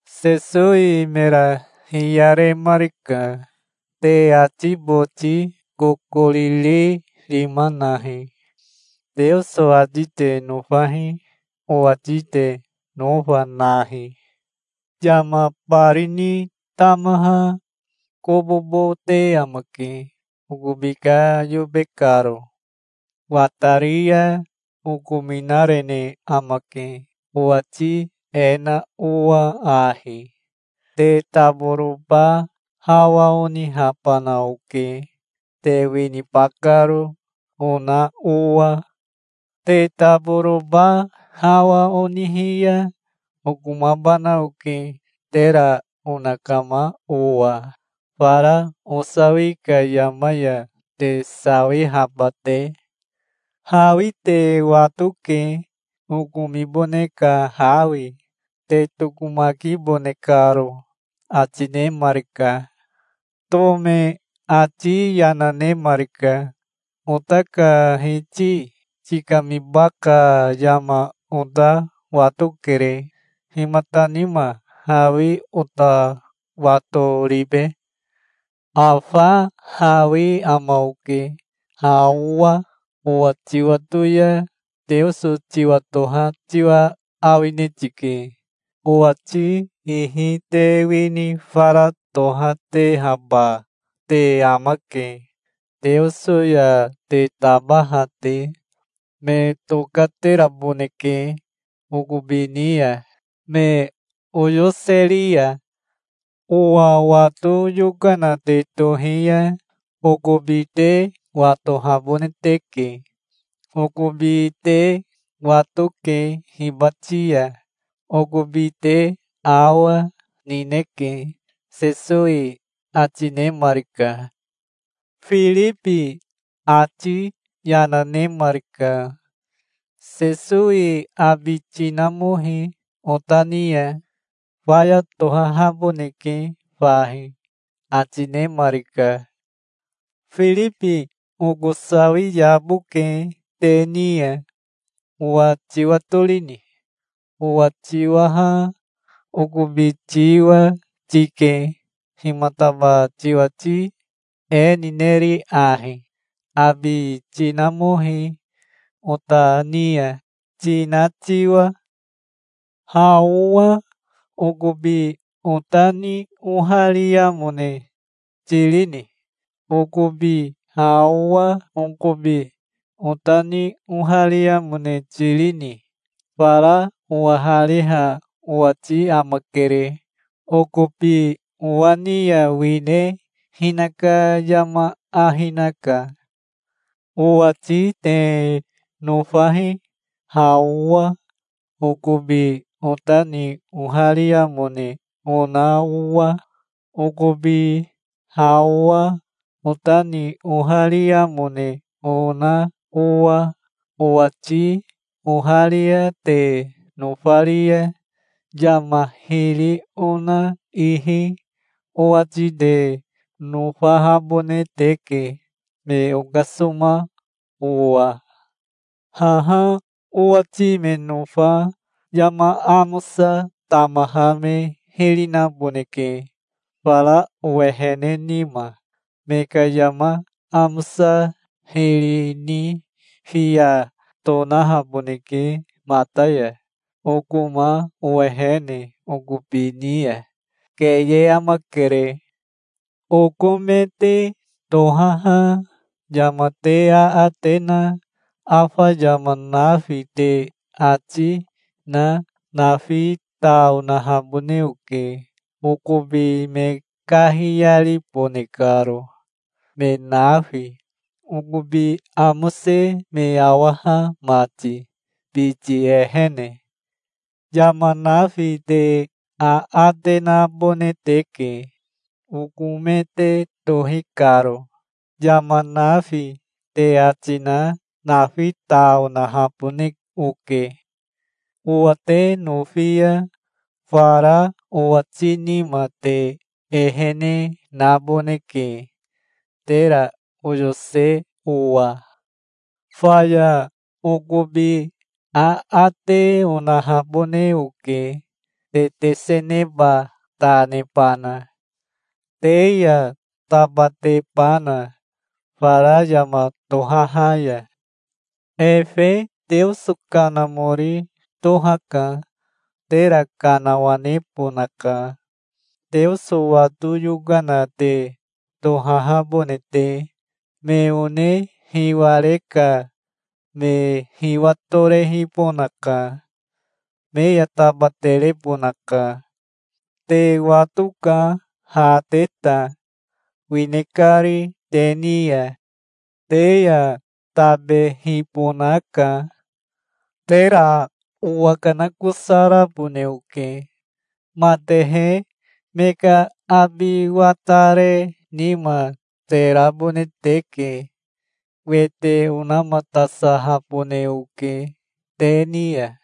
Sesowi mera hiyaremarika. "Te ati boti kokoriri rima nahi. Teoso ati te nofahi. Owati te nofa nahi. Yama bari ni tamaha kobobo te amake okobi ka yobe karo. Watari ya okominarene amake, owati e na owa ahi: 'Te taboroba hawa onihabana oke, te winiba karo', ona owa. Te taboroba hawa onihi ya okomabana oke tera onakama owa, fara osawi ka yama ya te sawihaba te. Hawi te watoke, okomibone ka hawi, te tokomakibone karo", ati nemarika. Tome ati yana nemarika. "Ota ka Hiti tikamiba ka yama ota watokere. Himata nima hawi ota wato ribe?" "Afa hawi ama oke ha owa. Owa tiwato ya Teoso tiwatoha tiwa awine tike. Owati ihi te wini fara tohatehaba te amake Teoso ya te tabaha te. Me tokateraboneke okobi ni ya, me oyoseri ya. Owa wato yokana te tohi ya okobi te watohabone teke. Okobi te watoke hibati ya. Okobi te awa, nineke", Sesowi ati nemarika. Firibi ati yana nemarika. "Sesowi abi tinamohi ota ni ya. Faya tohahaboneke fahi", ati nemarika. "Firibi oko sawi yaboke te ni ya. Owa tiwatorini? Owa tiwaha okobi tiwa, tike. Himataba tiwati e nineri ahi: 'Abi tinamohi ota ni ya', tina tiwa? Ha owa okobi ota ni ohariamone tirini? Okobi ha owa okobi ota ni ohariamone tirini? Fara owahariha owati amakere. Okobi owa ni ya wine hinaka yama ahi naka. Owati te nofahi, ha owa okobi ota ni ohariamone ona owa, okobi ha owa ota ni ohariamone ona, owa. Owati oharia te nofari ya, yama hiri ona ihi owati te nofahabone teke, me okasoma owa. Haha owati me nofa yama amosa tamaha me hiri naboneke, fara owehene nima. Me ka yama amosa hiri ni fiya tonahaboneke mata ya, okoma owehene okobi ni ya. Keye amakere. Oko me te tohaha yama te aate na afa yama nafi te ati na nafi ta onahabone oke, okobi me kahiyaribone karo, me nafi, okobi amose me awaha mati, biti ehene. Yama nafi te aate nabone te ke, oko me te tohi karo. Yama nafi te ati na nafi ta onahabone oke". "Owa te nofi ya fara owati nima te ehene naboneke, tera oyose owa. Faya okobi aate onahabone oke te teseneba ta nebana, te ya tabatebana fara yama tohaha ya. Efe Teoso Kanamori tohaka. Tera kanawanebonaka, Teoso wato yokana te tohahabone te. Me one hiware ka me hiwatorehibonaka. Me ya tabaterebonaka. Te watoka ha te ta, wine kari te ni ya. Te ya tabehibonaka. Tera owakanakosarabone oke. Matehe me ka abi watare nima te rabone teke. Wete onamatasahabone oke te ni ya.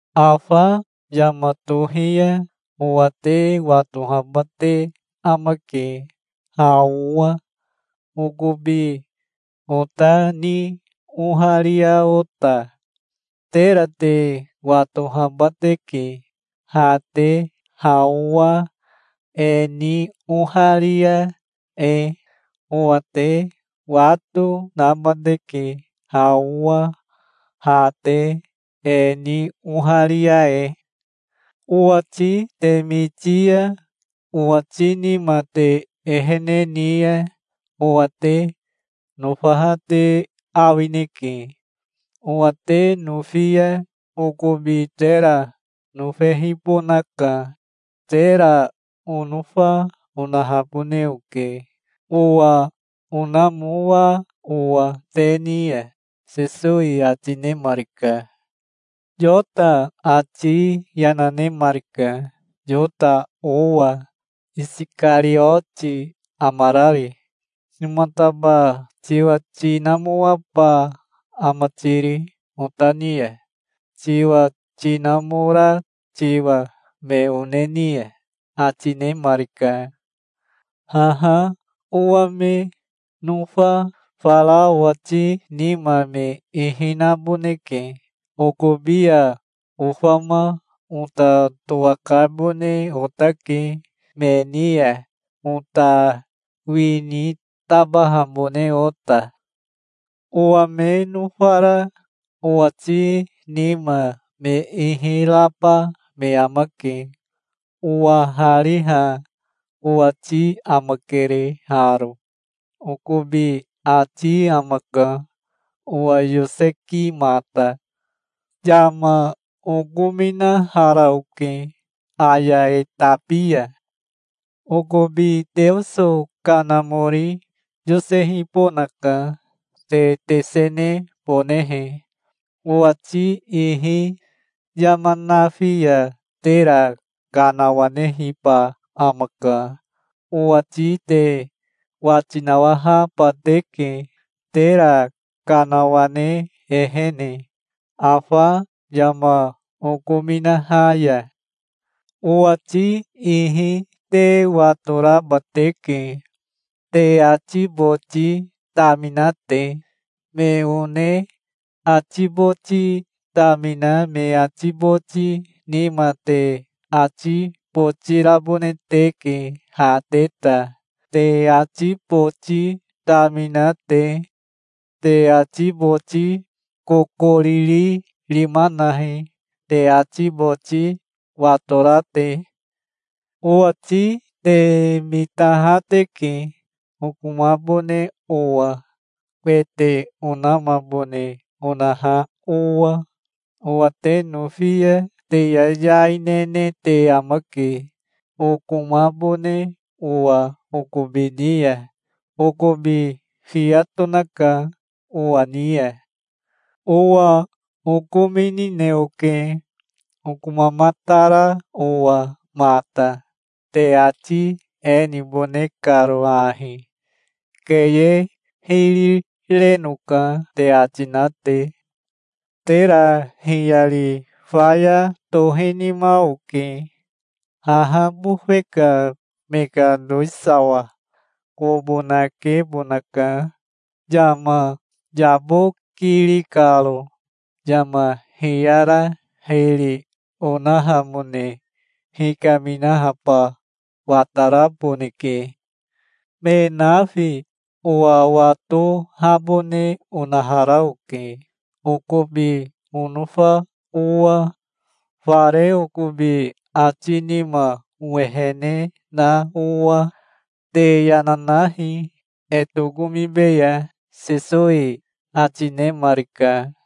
Afa yama tohi ya owa te watohaba te amake, ha owa okobi ota ni oharia ota. Tera te watohaba teke, ha te ha owa e ni oharia e. Owa te wato naba teke, ha owa ha te e ni oharia e. Owati te miti ya owati nima te ehene ni ya, owa te nofaha te awineke. Owa te nofi ya okobi tera nofehibonaka. Tera onofa onahabone oke, owa onamoa owa te ni ya", Sesowi ati nemarika. Yota ati yana nemarika, Yota owa, Isikarioti amarari. "Himataba tiwa tinamoaba ama tiri ota ni ya, tiwa tinamora tiwa me one ni ya?" ati nemarika. "Haha owa me nofa fara owati nima me ihi naboneke. Okobi ya ofama ota towakabone otake me ni ya, ota wini tabahabone ota. Owa me nofara owati nima me ihi raba me amake. Owahariha owati amakere haro. Okobi ati amaka, owa yosekimata". "Yama okominahara oke, aya e tabi ya. Okobi Teoso Kanamori yosehibonaka, te tesenebonehe, owati ihi. Yama nafi ya tera kanawanehiba amaka. Owati te wati nawahaba teke, tera kanawane ehene, afa yama okominaha ya. Owati ihi te watoraba teke, te ati boti tamina te. Me one ati boti tamina me ati boti nima te ati boti rabone teke ha te ta, te ati boti tamina te. Te ati boti kokoriri rima nahi, te ati boti watora te. Owati te mitaha teke, okomabone owa, wete onamabone onaha owa. Owa te nofi ya te yayai nene te amake, okomabone owa okobi ni ya. Okobi fiya tonaka owa ni ya. Owa okominine oke, okomamatara owa mata, te ati e nibone karo ahi: 'Keye hiri renoka', te ati na te. Tera hiyari faya tohinima oke, haha bofe ka me ka towisawa kobo nakebona ka yama yabokiri karo. Yama hiyara hiri onahamone hikaminahaba wataraboneke. Me nafi owa watohabone onahara oke, okobi onofa owa, fare okobi ati nima owehene na owa. Te yana nahi. E tokomibeya", Sesowi ati nemarika.